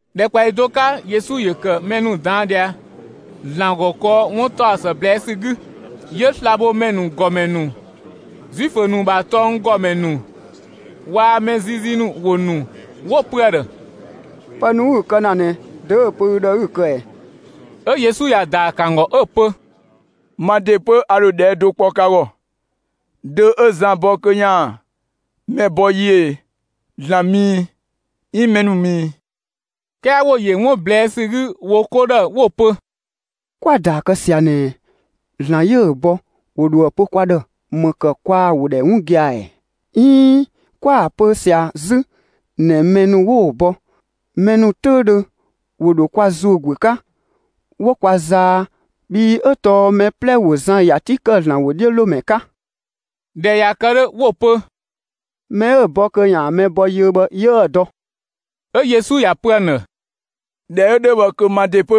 ‑Dhɛkpaɔyi do 'ka Yesu ‑yö ‑kë mɛ ‑nu ꞊daan' ꞊dhia ‑Zlan ‑gɔ kɔɔ 'wuntaɔsë ꞊blɛɛ' ‑sü 'gü. 'Yö slabhomɛ ‑nu ‑gɔmɛ ‑nu, Zuifö ‑nu ‑bha tɔnggɔmɛ ‑nu waa‑ mɛ ziizii ‑nu ‑wo ‑nu, 'wo‑ pö ‑a ‑dhë: «Pë ‑nu 'ü‑ kë ‑na ꞊nɛ, dö 'ö‑ pö ü ‑dhë 'ü‑ kë ꞊ɛ?» 'Ö Yesu ‑ya ‑daa ‑kë ‑an ‑gɔ 'ö‑ pö: «Ma ‑de 'pö, a ‑dho ꞊dhɛɛ' do kpɔ ka ‑gɔ: Dö 'ö Zan bɔ kö ‑yaan mɛ bɔ yiö ꞊e? ‑Zlan ‑mü ‑i, 'iin mɛ ‑nu ‑mü ‑i?» 'Kɛɛ ‑wo ‑yö 'wun ꞊blɛɛ' ‑sü 'gü wo 'ko ‑dhë 'wo‑ pö: «'Kwa‑ ‑daa kë ꞊sia ꞊nɛ ‑Zlan 'yö‑ bɔ, ‑yö ‑dhoë pö kwa ‑dhë ‑më ‑kë kwaa‑ ‑wo ‑dhɛ 'wun gia‑ ‑ɛ? 'Iin 'kwa‑ pö ꞊sia 'zü ꞊nɛ mɛ ‑nu 'wo‑ bɔ, mɛ ‑nu 'töüdhö ‑wo ‑dho kwa ‑zuö ‑guö 'ka 'wo kwa zaa, bhii 'ö tɔɔ mɛ 'plɛ ‑wo Zan ‑ya 'ti ‑kë ‑Zlan ‑wodhiölomɛ 'ka.» ꞊Dhɛ ꞊ya kë 'dhö, 'wo‑ pö: «Mɛ 'ö‑ bɔ kö ‑yaan mɛ bɔ yiö bhë 'yiëë‑ dɔ.» 'Ö Yesu ‑ya pö ‑an ‑dhë: «꞊Dhɛ 'ö 'dhö bhë kö ma ‑de 'pö,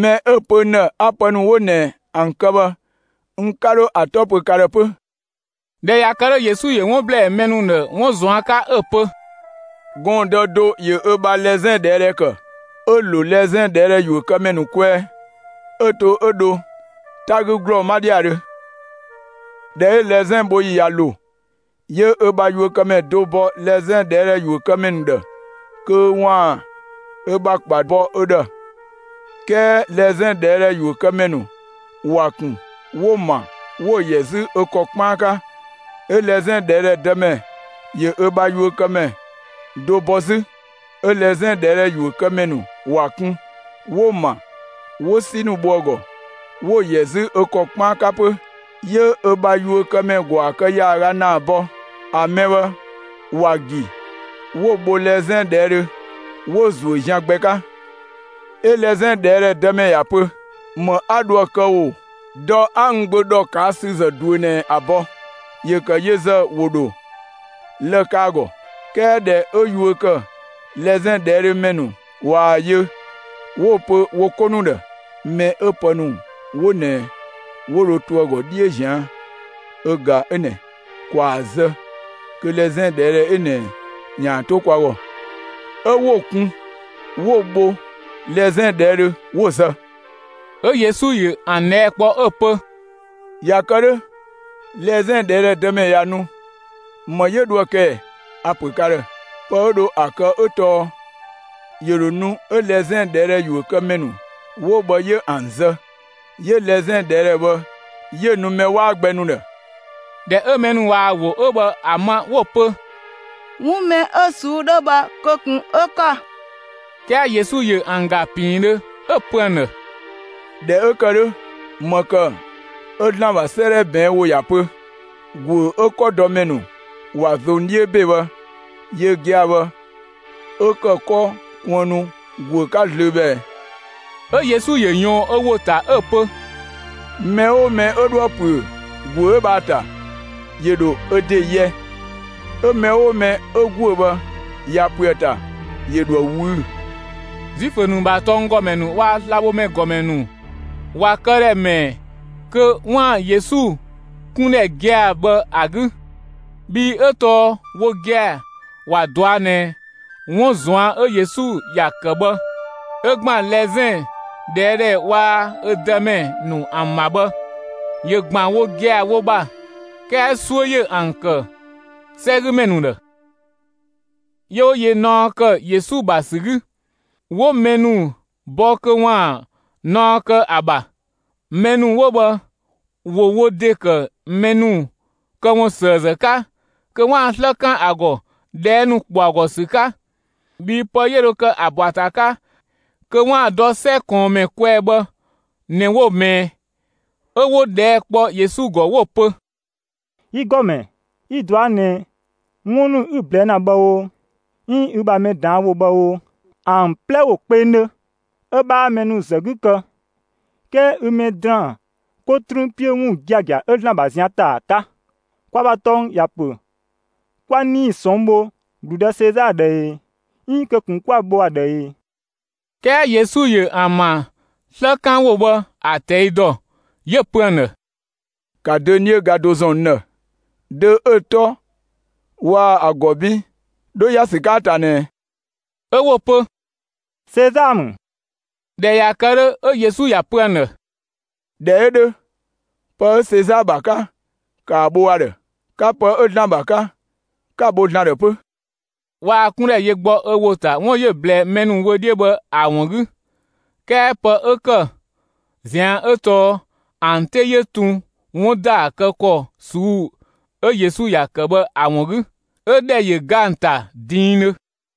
mɛ 'ö‑ pö n ‑dhë 'a pë ‑nu 'wo ꞊nɛ ‑an kë bhë, n 'ka 'dho ‑a 'tɔ pö ka ‑dhë 'pö.» ꞊Dhɛ ꞊ya kë 'dhö, Yesu ‑yö 'wun ‑blɛɛ mɛ ‑nu ‑dhë 'wun ꞊zuan' 'ka 'ö ‑pö: «Gɔɔndë do ‑yö ö bha lɛzɛn ꞊dhɛɛdhɛ ‑kë, 'ö‑ ‑lo lɛzɛn ꞊dhɛɛdhɛ yuökëmɛ ‑nu kwɛɛ, 'ö‑ to 'ö dho 'ta 'gü ‑glɔɔ 'ma ‑dhiadhö. ꞊Dhɛ 'ö lɛzɛn bho ‑yi ꞊ya ‑lo, 'yö ö bha yuökëmɛ do bɔ lɛzɛn ꞊dhɛɛdhɛ yuökëmɛ ‑nu ‑dhë kö ‑waan ö ‑bha ‑kpa bɔ ö ‑dhë. 'Kɛɛ lɛzɛn ꞊dhɛɛdhɛ ‑yuökëmɛ ‑nu ‑wa ‑kun 'wo‑ ‑ma 'wo‑ ‑yɛ 'zü ö ‑kɔ 'kpaan 'ka. 'Ö lɛzɛn ꞊dhɛɛdhɛ dëmɛ ‑yö ö bha yuökëmɛ do bɔ 'zü, 'ö lɛzɛn ꞊dhɛɛdhɛ ‑yuökëmɛ ‑nu ‑wa kun, 'wo‑ ‑ma, 'wo 'si ‑nu bho ‑a ‑gɔ, 'wo‑ ‑yɛ 'zü ö ‑kɔ 'kpaan 'ka 'pö. 'Yö ö ‑bha yuökëmɛ ‑gwaa kë ‑yaaga ‑naa bɔ; ‑a mɛ bhë ‑wa ‑gi 'wo‑ bho lɛzɛn ꞊dhɛɛdhö, 'wo‑ ‑zuö zian gbɛ 'ka. 'Ö lɛzɛn ꞊dhɛɛdhɛ dëmɛ ‑ya pö: ‹‑Më 'a dho ‑a kë ꞊o? Dɔ, 'a n gbö ‑dhɔkaasüzë ꞊duö ꞊nɛ ‑a bɔ, ‑yö ‑kë yö ‑zë ‑wo ‑dho lë‑ ‑kë ‑a ‑gɔ.› 'Kɛɛ ꞊dhɛ 'ö yuö ‑kë lɛzɛn ꞊dhɛɛdhö ‑mɛ ‑nu ꞊waa‑ yö, 'wo‑ pö wo 'ko ‑nu ‑dhë: ‹Mɛ 'ö pë ‑nu 'wo ꞊nɛ 'wo dho to ‑a ‑gɔ 'dhiö ꞊zian' ö ꞊ga 'ö ꞊nɛ! ‑Kwaa zë kö lɛzɛn ꞊dhɛɛdhɛ 'ö ꞊nɛ ‑yaan 'to kwa ‑gɔ!› 'Ö 'wo‑ kun, 'wo‑ bho lɛzɛn ꞊dhɛɛdhö 'wo‑ zë.» 'Ö Yesu ‑yö ‑an ꞊dhɛɛ' kpɔ 'ö‑ pö: «꞊Ya kë 'dhö, lɛzɛn ꞊dhɛɛdhɛ dëmɛ ꞊ya nu, ‑më 'yö dho ‑a kë ꞊ɛ? A‑ ‑pö ka ‑dhë: Pë 'ö dho ‑a kë 'ö tɔɔ ‑yö ‑dho nu 'ö lɛzɛn ꞊dhɛɛdhɛ ‑yuökëmɛ ‑nu 'wo bhë 'yö ‑an zë, 'yö lɛzɛn ꞊dhɛɛdhɛ bhë 'yö‑ nu mɛ 'waa gbɛ ‑nu ‑dhë.» ꞊Dhɛ 'ö mɛ ‑nu ꞊waa‑ ‑wo 'ö bhë ‑a ma 'wo‑ pö: «'Wun mɛ 'ö ꞊suu'‑ 'dhö bhë kö ꞊kun 'ö‑ ‑kë!» 'Kɛɛ Yesu ‑yö ‑an ‑ga ‑piindhö 'ö‑ pö ‑an ‑dhë: «꞊Dhɛ 'ö ‑kë 'dhö, ‑më ‑kë 'ö ‑Zlan ‑bha 'sëëdhɛ ꞊bɛɛn' ‑wo ‑ya pö: ‑Guö 'ö 'kɔdɔmɛ ‑nu ‑wa ꞊zong 'dhiö ‑be bhë, yö gia‑ bhë 'ö ‑kë 'kɔ kuënnu ‑guö 'ka zlöö bhë ꞊ɛ?» 'Ö Yesu ‑yö ꞊yɔɔn ö ‑wo ‑ta 'ö‑ pö: «Mɛ 'oo mɛ 'ö 'dhoë‑ ‑püö ‑guö 'ö bhë ‑a ‑ta, ‑yö ‑dho ö ‑de yɛ, 'ö mɛ 'oo mɛ 'ö ‑guö bhë ꞊ya ‑püö ‑a ‑ta, ‑yö ‑dho ‑a ꞊wüü'‑.» Zuifö ‑nu ‑bha tɔnggɔmɛ ‑nu waa‑ slabhomɛ ‑gɔmɛ ‑nu ‑wa këdhɛ ‑mɛɛ kö 'waan‑ Yesu 'kundhɛ gia‑ bhë ‑a 'gü, bhii 'ö tɔɔ wo gia‑ ‑wa ꞊dɔa' ꞊nɛ 'wun ꞊zuan' 'ö Yesu ‑ya ‑kë bhë ‑ö ‑gban lɛzɛn ꞊dhɛɛdhɛ waa‑ ö dëmɛ ‑nu ‑an ‑bha bhë, ‑yö ‑gban wo gia‑ wo ‑bha, 'kɛɛ 'suö ‑yö ‑an ‑kë 'sɛgümɛ ‑nu ‑dhë. 'Yö 'wo yö naɔ ‑kë Yesu ‑bha ‑sü 'gü; 'wo mɛ ‑nu bɔ kö ‑waan naɔ kë ‑a ‑bha. Mɛ ‑nu 'wo bhë ‑wo wo ‑de ‑kë mɛ ‑nu këwunsëëzë 'ka kö 'waan‑ 'slë 'kan ‑a ‑gɔ ꞊dhɛɛ' ‑nu ‑kpɔ ‑a ‑gɔ ‑sü 'ka. Bhii pë 'yö dho kë ‑a ‑bɔ ‑a ‑ta 'ka kö 'waan‑ ‑a dɔ 'sɛ ꞊kɔɔnmɛ kwɛɛ bhë ꞊nɛ 'wo‑ ꞊mɛɛ'. 'Ö 'wo ꞊dhɛɛ' kpɔ Yesu ‑gɔ 'wo‑ pö: «Yi ‑Gɔmɛ, yi‑ ꞊dɔa' ꞊nɛ 'wun ‑nu 'ü‑ ꞊blɛɛ' ‑na bhë o, 'iin ü ‑bha mɛ ꞊daan' ‑wo bhë o, ‑an 'plɛ ‑wo kpengdhö; 'ö 'bhaa mɛ ‑nu zë 'gü kë, 'kɛɛ ü mɛ ‑daan 'ko 'trüün 'piö 'wun giagia 'ö ‑Zlan ‑bha zian ‑ta ‑a 'ka. Kwa ‑bha tɔng ‑ya ‑pö 'kwa 'nii‑ ꞊sɔnng' bho ‑gludë Sezaa ‑dhë e, 'iin kö ꞊kun 'kwa‑ bho ‑a ‑dhë e?» 'Kɛɛ Yesu ‑yö ‑an ‑bha 'slëkanwo bhë ‑a ꞊tɛi' ‑dɔ; 'yö‑ pö ‑an ‑dhë: «‑Ka dönie ga do ‑zɔn n ‑dhë! Dö 'ö‑ 'tɔ waa‑ ‑a ‑gɔ 'bin 'dho ‑ya ‑sü 'ka ‑a ‑ta ꞊nɛɛ?» 'Ö 'wo‑ pö: «Sezaa ‑mü.» ꞊Dhɛ ꞊ya kë 'dhö, 'ö Yesu ‑ya pö ‑an ‑dhë: «꞊Dhɛ 'ö 'dhö, pë 'ö Sezaa ‑bha 'ka, ‑kaa bho ‑a ‑dhë; 'ka pë 'ö ‑Zlan ‑bha 'ka, 'ka‑ bho ‑Zlan ‑dhë 'pö!» Waa‑ 'kundhɛ yö gbɔ ö ‑wo ‑ta 'wun 'yö‑ ꞊blɛɛ mɛ ‑nu wö 'dhiö bhë ‑a ‑wun 'gü, 'kɛɛ pë 'ö ‑kë ꞊zian' 'ö tɔɔ ‑an 'te 'yö tun 'wun ‑daa kë ‑kɔ ꞊suu'‑ 'ö Yesu ‑ya ‑kë bhë ‑a ‑wun 'gü; 'ö ‑dhɛ ‑yö ga ‑an ‑ta diindhö.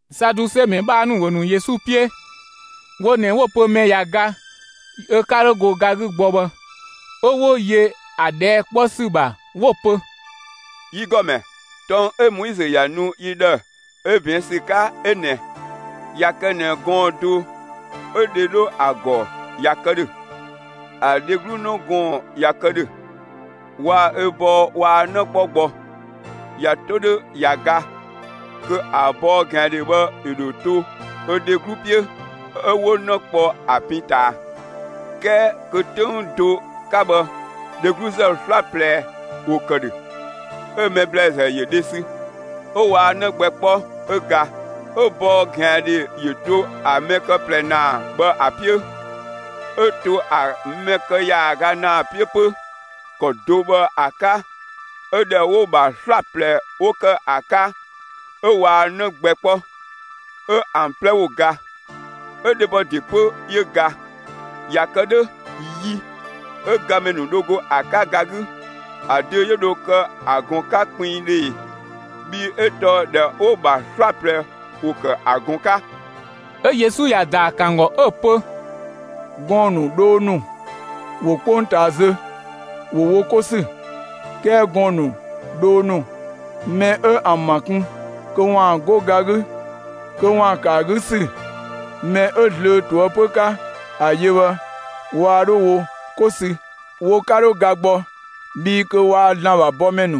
Saduse ‑mɛ 'bhaa ‑nu ‑wo ‑nu Yesu 'piö; wo ꞊nɛ 'wo‑ pö mɛ ꞊ya ga ö 'ka 'dho go ga 'gü gbɔ bhë, 'ö 'wo yö ‑a ꞊dhɛɛ' 'kpɔ ‑sü ‑bha 'wo‑ pö: «Yi ‑Gɔmɛ, tɔng 'ö Moizö ‑ya nu yi ‑dhë 'ö ꞊bɛɛn' ‑sü 'ka 'ö ꞊nɛɛ: ꞊Ya kë ꞊nɛ gɔɔn‑ do 'ö‑ dhe 'dho ‑a ‑gɔ ꞊ya kë ‑dhö, ‑a dheglu 'në gɔɔn‑ ꞊ya kë ‑dhö; waa‑ ö bɔɔ waa 'në 'kpɔ gbɔ, ꞊ya 'to 'dhö ꞊ya ga kö ‑a bɔɔ ꞊gɛandhe bhë ‑yö ‑dho to ‑a dheglu 'piö, 'ö 'wo 'në kpɔ ‑a pin ꞊taa. 'Kɛɛ kö 'töng do 'ka bhë, dhegluzë 'slaplɛ ‑wo ‑kë ‑dhö; 'ö‑ mɛ ‑blɛɛzë ‑yö dhe sü, 'ö waa 'në gbɛ 'kpɔ 'ö ga. 'Ö‑ bɔɔ ꞊gɛandhe ‑yö to ‑a mɛ kë ꞊plɛ ‑naa bhë ‑a 'piö, 'ö to ‑a mɛ kë ‑yaaga ‑naa 'piö 'pö. ‑Kɔ do bhë ‑a 'ka 'ö ‑dhɛ 'wo‑ ‑bha 'slaplɛ 'wo‑ ‑kë ‑a 'ka, 'ö waa 'në gbɛ 'kpɔ, 'ö ‑an 'plɛ ‑wo ga. 'Ö dhebɔ ‑de 'pö 'yö ga. ꞊Ya kë 'dhö, yi 'ö gamɛ ‑nu dho go ‑a 'ka ga 'gü, ‑a dö 'yö dho kë ‑a ꞊gɔn 'ka kpinngdhö ꞊e? Bhii 'ö tɔɔ ‑dhɛ 'ö 'wo‑ ‑bha 'slaplɛ ‑wo ‑kë ‑a ꞊gɔn 'ka!» 'Ö Yesu ‑ya ‑daa ‑kë ‑an ‑gɔ 'ö‑ pö: «Gɔɔn‑ ‑nu, dhoo ‑nu ‑wo 'kpongtaa zö ‑wo wo 'ko ‑sü, 'kɛɛ gɔɔn‑ ‑nu, dhoo ‑nu, mɛ 'ö ‑an ‑ma ꞊kun kö ‑waan 'go ga 'gü kö ‑waan ‑kë ‑a 'gü ‑sü mɛ 'ö zlöö ꞊toëpö 'ka ‑a yö bhë, waa 'dho wo 'ko sü, wo 'ka 'dho ga gbɔ, bhii kö waa‑ ‑Zlan ‑bha bɔmɛ ‑nu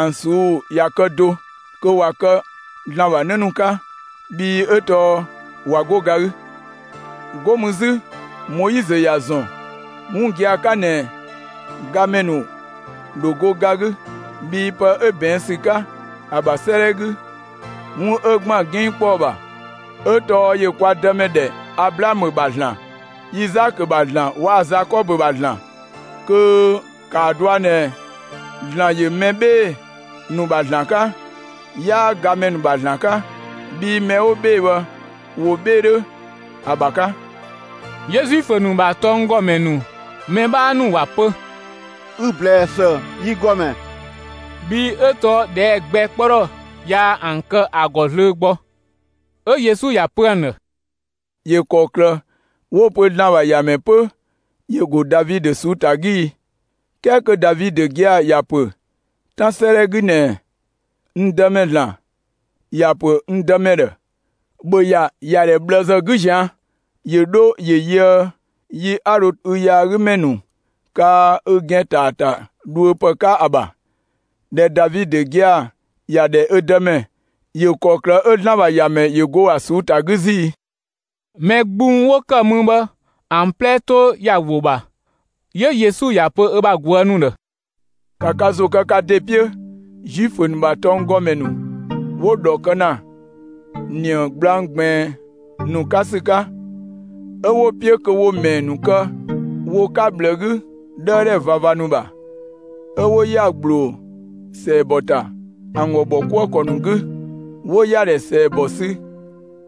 ‑an ꞊suu'‑ ꞊ya kë do; kö ꞊wa kë ‑Zlan ‑bha 'në ‑nu 'ka, bhii 'ö tɔɔ ꞊wa 'go ga 'gü. 'Go mü 'zü Moizö ‑ya ‑zɔn 'wun gia‑ 'ka ꞊nɛ gamɛ ‑nu ‑wo ‑dho go ga 'gü, bhii pë 'ö ꞊bɛɛn' ‑sü 'ka ‑a ‑bha 'sëëdhɛ 'gü, 'wun 'ö ‑gban 'ginngkpɔɔ ‑bha, 'ö tɔɔ ‑yö kwa Dëmɛ ‑dhɛ Ablaamö ‑bha ‑Zlan, Izaakö ‑bha ‑Zlan waa‑ Zakɔbö ‑bha ‑Zlan. Kö ‑kaa dɔa ꞊nɛ ‑Zlan ‑yö mɛ 'bhee‑ ‑nu ‑bha ‑Zlan 'ka, 'yaa gamɛ ‑nu ‑bha ‑Zlan 'ka, bhii mɛ 'wo 'bhee‑ bhë ‑wo 'bhee‑ 'dhö ‑a ‑bha 'ka.» 'Yö Zuifö ‑nu ‑bha tɔnggɔmɛ ‑nu mɛ 'bhaa ‑nu ‑wa pö: «Ü‑ ‑blɛɛ ‑së, yi ‑Gɔmɛ!» Bhii 'ö tɔɔ ꞊dhɛɛ' gbɛ 'kpɔ ‑dhɔ yaa ‑an kë ‑a ‑gɔ zlöö gbɔ. 'Ö Yesu ‑ya pö ‑an ‑dhë: «‑Yö ‑kɔklë 'wo‑ pö ‑Zlan ‑bha ‑Yamɛ 'pö ‑yö ‑go Davidö ꞊suu'‑ ‑ta 'gü i? 'Kɛɛ kö Davidö gia‑ ‑ya ‑pö 'Tan 'sëëdhɛ 'gü ꞊nɛɛ: N Dëmɛ (‑Zlan) ‑ya ‑pö n Dëmɛ ‑dhë: ‑Bhö ‑ya ‑yadhɛ ꞊bhlëzë 'gü ꞊zian' ‑yö 'dho ‑ö yöë yi 'a dho ü yaagümɛ ‑nu kaa ü ‑gɛn ‑ta ‑a ‑ta dhuö ‑pë 'ka ‑a ‑bha. ꞊Dhɛ Davidö gia‑ ‑ya ‑dhɛ ö Dëmɛ, ‑yö ‑kɔklë 'ö ‑Zlan ‑bha ‑Yamɛ ‑yö ‑go ‑a ꞊suu'‑ ‑ta 'gü 'zü i?» Mɛ gbung 'wo ‑kë mü bhë ‑an 'plɛ 'to ‑ya ‑wo ‑bha. 'Yö Yesu ‑ya pö ö bha ꞊guë' ‑nu ‑dhë: «‑Ka ka ‑zo kë ka ‑de 'piö Zuifö ‑nu ‑bha tɔnggɔmɛ ‑nu 'wo‑ ‑dhɔ kë ‑na ꞊nië gblang ꞊gbiin ‑nu 'ka ‑sü 'ka, 'ö 'wo‑ 'piö kö ‑wo ‑mɛɛ ‑nu kë wo 'ka ꞊bhlë 'gü 'dhëëdhɛ ꞊vava ‑nu ‑bha, 'ö 'wo ‑ya ‑gbloo ‑sɛɛbɔ ‑ta ‑an ‑gɔ ‑bhɔkuëkɔ ‑nu 'gü, 'wo ‑yadhɛ ‑sɛɛbɔ sü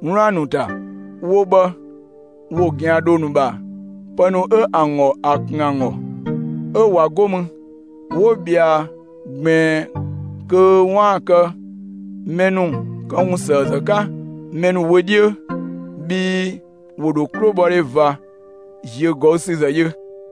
'wlaan‑ ‑nu ‑ta; wo bhë ‑wo ꞊gɛandhoo ‑nu ‑bha pë ‑nu 'ö ‑an ‑gɔ ‑a kun ‑an ‑gɔ, 'ö ꞊wa 'go mü 'wo ꞊bhɛa ꞊gbiin kö 'waan‑ kë mɛ ‑nu këwunsëëzë 'ka mɛ ‑nu wö 'dhiö. Bhii ‑wo ‑dho 'klobhɔdhe ꞊va ‑ziögɔüsüzë yö.»